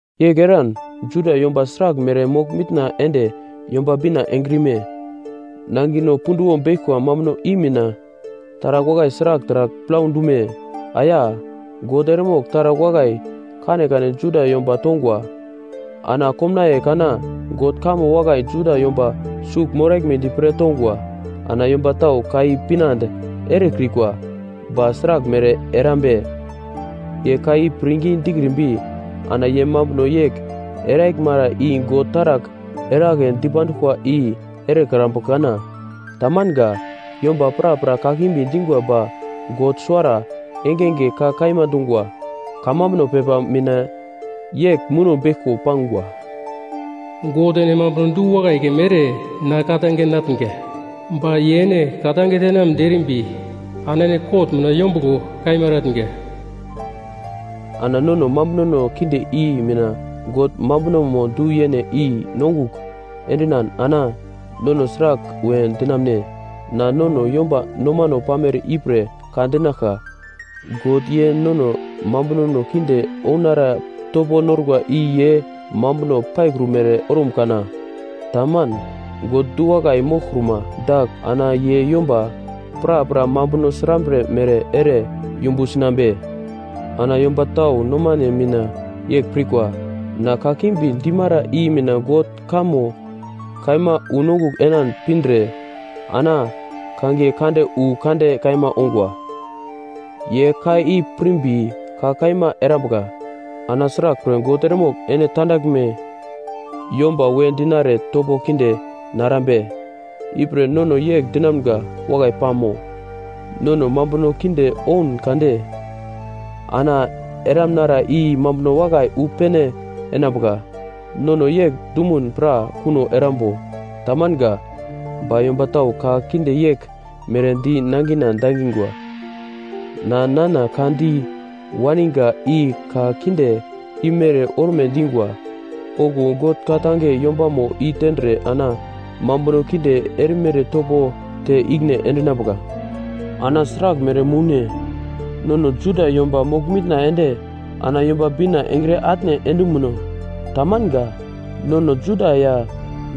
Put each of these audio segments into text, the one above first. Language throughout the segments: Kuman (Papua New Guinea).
Yegl eran, Juda yomba sraglmere mogl-mitna ende Yomba Bina engrime? Nangino punduwo beglkwa mambuno i mina, taragl wakai sragl taragl plau dume? Aya! God eremogl taragl wakai kanekane Juda yomba tongwa. Ana komnaiye kana God kamo wakai Juda yomba sugl moraglmedi pre tongwa. Ana yomba tau ka i pinande erekrikwa. Ba sraglmere erambe? Ye ka i pirngi dikrimbi ana ye mambuno yegl eraglmara i God taragl eragle dipanduglkwa i erekrambu kana? Tamanga! Yomba prapra kakimbi dingwa ba God suwara engenge ka kaima dungwa. Kamambuno pepa mina yegl muno beglko pangwa, “God, ene mambuno du-wakai keme ere na ka-tange natnga ba ye ene ka-tange tenamnedi erimbi ana ene kot mina yombuglo kaima eratnga.” Ana nono mambunono kinde i mina God mambunomo du-yene i-nongugl endinan ana nono sragl we dinamune? Na nono yomba nomano pamere ipre ka dinaglka. God ye nono mambunono kinde ounara topo norkwa i ye mambuno paikrumere orum kana? Taman! God du-wakai moglkruma dagl ana ye yomba prapra mambuno srambre mere ere yumbu sinambe? Ana tau yomba nomane mina yegl pirkwa, na kakimbi dimara i mina God kamo kaima unongugl enan pindre ana kangiye kande wu kande kaima ongwa. Ye ka i pirmbi ka kaima erambuka, ana sraglpre God eremogl ene tandaglme yomba we dinare topo kinde narambe? Ipre nono yegl dinamga wakai pamo? “Nono mambuno kinde oun kade ana eramnara i mambuno wakai wu pene enambuka.” Nono yegl dumun pra kuno erambo? Tamanga! Ba yomba tau ka kinde yegl mere di nangina dangingwa. Na nana ka di waniga i ka kinde imere orme dingwa. Okuwo God ka-tange yombamo i tendre ana mambuno kinde erimere topo te ikine endinambuka. Ana sraglmere moune? Nono Juda yomba mogl-mitna ende ana Yomba Bina engre atne endumuno? Tamanga! Nono Juda ya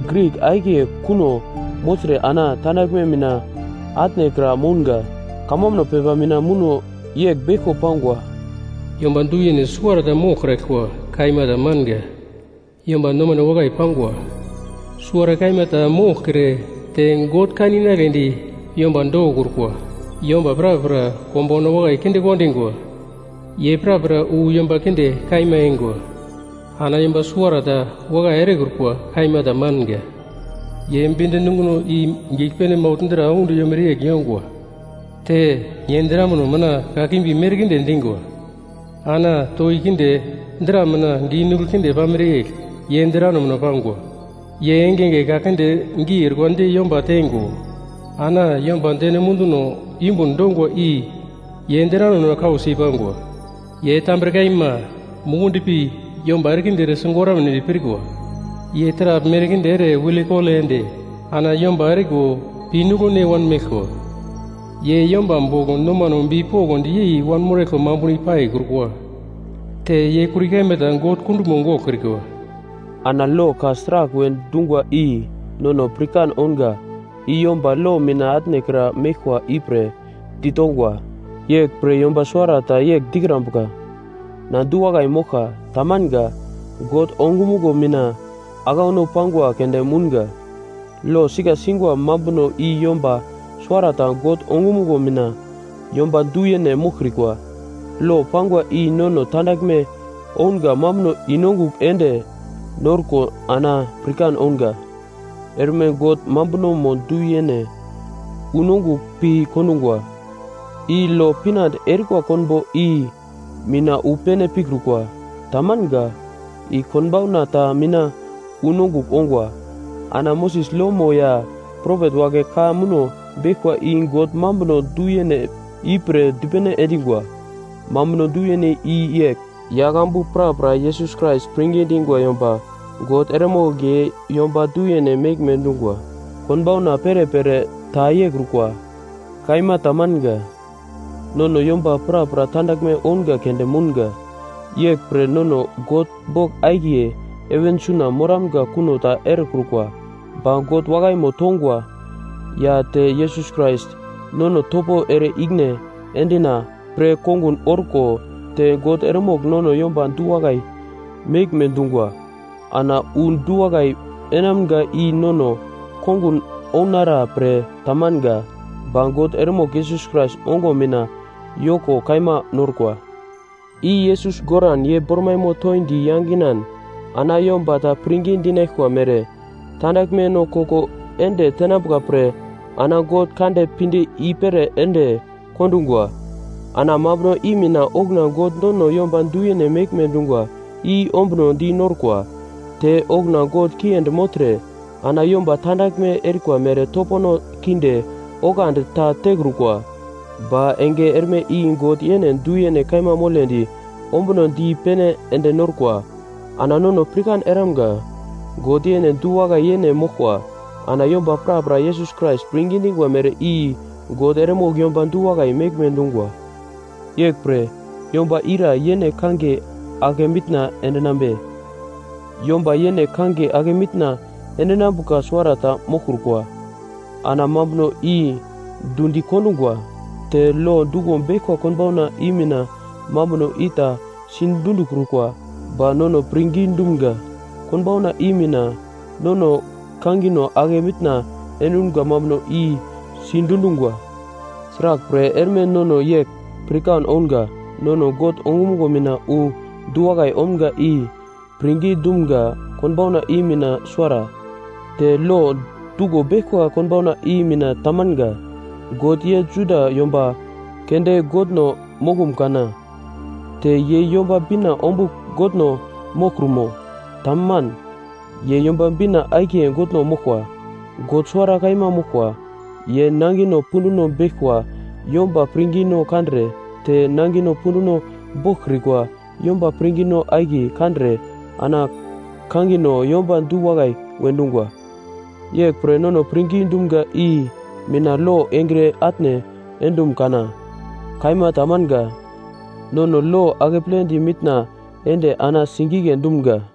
Grik akiye kuno mogltre ana tandaglme mina atnekra mounga. Kamambuno pepa mina muno yegl beglko pangwa: “Yomba du-yene suwarata moglkraglkwa kaima tamanga! Yomba nomane wakai pangwa suwara kaima ta moglkre te God kan inagledi yomba dokokrukwa. Yomba prapra konbauna wakai kinde kondingwa. Ye prapra wu yomba kinde kaima eingwa. Ana yomba suwarata wakai erekrukwa. Kaima tamanga!” “Ye bind nunguno i giglpene maugl dra audi yomere yegl yongwa te ye drambino mina kakimbi merkinde dingwa.” “Ana toki kinde dra mina giu nuglo kinde pamere yegl ye drano mina pangwa.” “Ye engenge ka kinde geu orkwa di yomba teingo ana yomba deno munduno yumbun dongwa i ye drano mina kausi pangwa.” “Ye tambre kaima mukundi pi yomba erekinde ere sigoramnedi pirkwa. Ye taragl merkinde ere wilekole ende ana yomba eriko pinuglone wanmeglkwa. Ye yomba bogl nomane bipokndi yei wanmoraglkwa mambuno i paikrukwa.” “Te ye kuri kaima ta God kunduglmo goglkrikwa.” Ana lo ka sragl we dungwa i nono pirkan ounga i yomba lo mina atnekra meglkwa ipre ditongwa. Yeglpre, yomba suwarata yegl dikrambuka, “Na du-wakai moglka!” Tamanga! Nono yomba makan koglkoglo mogl omga i God ongumuglo mina aglauno pangwa keunde mounga. Lo sika singwa mambuno i yomba suwarata God ongumuglo mina yomba du-yene moglkrikwa. Lo pangwa i nono tandaglme ounga mambuno i-nongugl ende norko ana pirkan ounga. Erme God mambunomo du-yene unongugl pi kondungwa. I lo pinande erikwa konbo i mina wu pene pikrukwa, tamanga. I konbauna ta mina wu nongugl ongwa. Ana Moses lomo ya propet wagle ka muno beglkwa i God mambuno du-yene ipre dipene endingwa. Mambuno du-yene i yegl. Yaglambu prapra Yesus Krais pirngi dingwa yomba God eremogl ye yomba du-yene meglme dungwa. Konbauna perepere ta yeikrukwa. Kaima tamanga. Nono yomba prapra tandaglme ounga keunde mounga, yegl pre nono God bogl akiye heven suna moramga kuno ta erekrukwa. Ba God wakaimo tongwa, ya te Yesus Krais nono topo ere i-ikine endina pre kongun orko te God eremogl nono yomba du-wakai meglme dungwa. Ana wu du-wakai enamga i nono kongun ounara pre ta manga, ba God eremogl Yesus Krais ongo mina yoko kaima norkwa. I Yesus goran ye bormaimo toindi yanginan ana yomba ta pirngi dinaglkwa mere, tandaglmeno koko ende tenambuka pre ana God kande pinde i-pere ende kondungwa. Ana mambuno i mina okuna God nono yomba du-yene meglme dungwa i ombunodi norkwa. Te okuna God kiendi mogltre, ana yomba tandaglme erikwa mere topono kinde oglandi ta tekrukwa. Ba enge erme i God yene du-yene kaima moledi ombuno di pene ende norkwa. Ana nono pirkan eramga, God yene du-wakai yene moglkwa. Ana yomba prapra Yesus Krais pirngi dingwa mere i God eremogl yomba du-wakai meglme dungwa. Yeglpre, yomba ira yene kangiye ake mitna endinambe? Yomba yene kangiye ake mitna endinambuka suwarata moglkrukwa. Ana mambuno i dundi kondungwa. Te lo duglo beglkwa konbauna i mina mambuno ita sidundikrukwa, ba nono pirngi dumga konbauna i mina nono kangino ake mitna endumga mambuno i sidundungwa. Sraglpre, erme nono yegl pirkan ounga nono God ongumuglo mina wu du-wakai omga i pirngi dumga konbauna i mina suwara. Te lo duglo beglkwa konbauna i mina tamanga. God ye Juda yomba keunde Godno moglum kana? Te ye Yomba Bina ombugl Godno moglkrumo? Taman, ye Yomba Bina akiye Godno moglkwa. God suwara kaima moglkwa. Ye nangino punduno beglkwa yomba pirngino kandre te nangino punduno boglkrikwa yomba pirngino akiye kandre ana kangino yomba du-wakai we dungwa. Yeglpre, nono pirngi dumga i mina lo engre atne endum kana? Kaima tamanga! Nono lo akepledi mitna ende ana singigle dumga.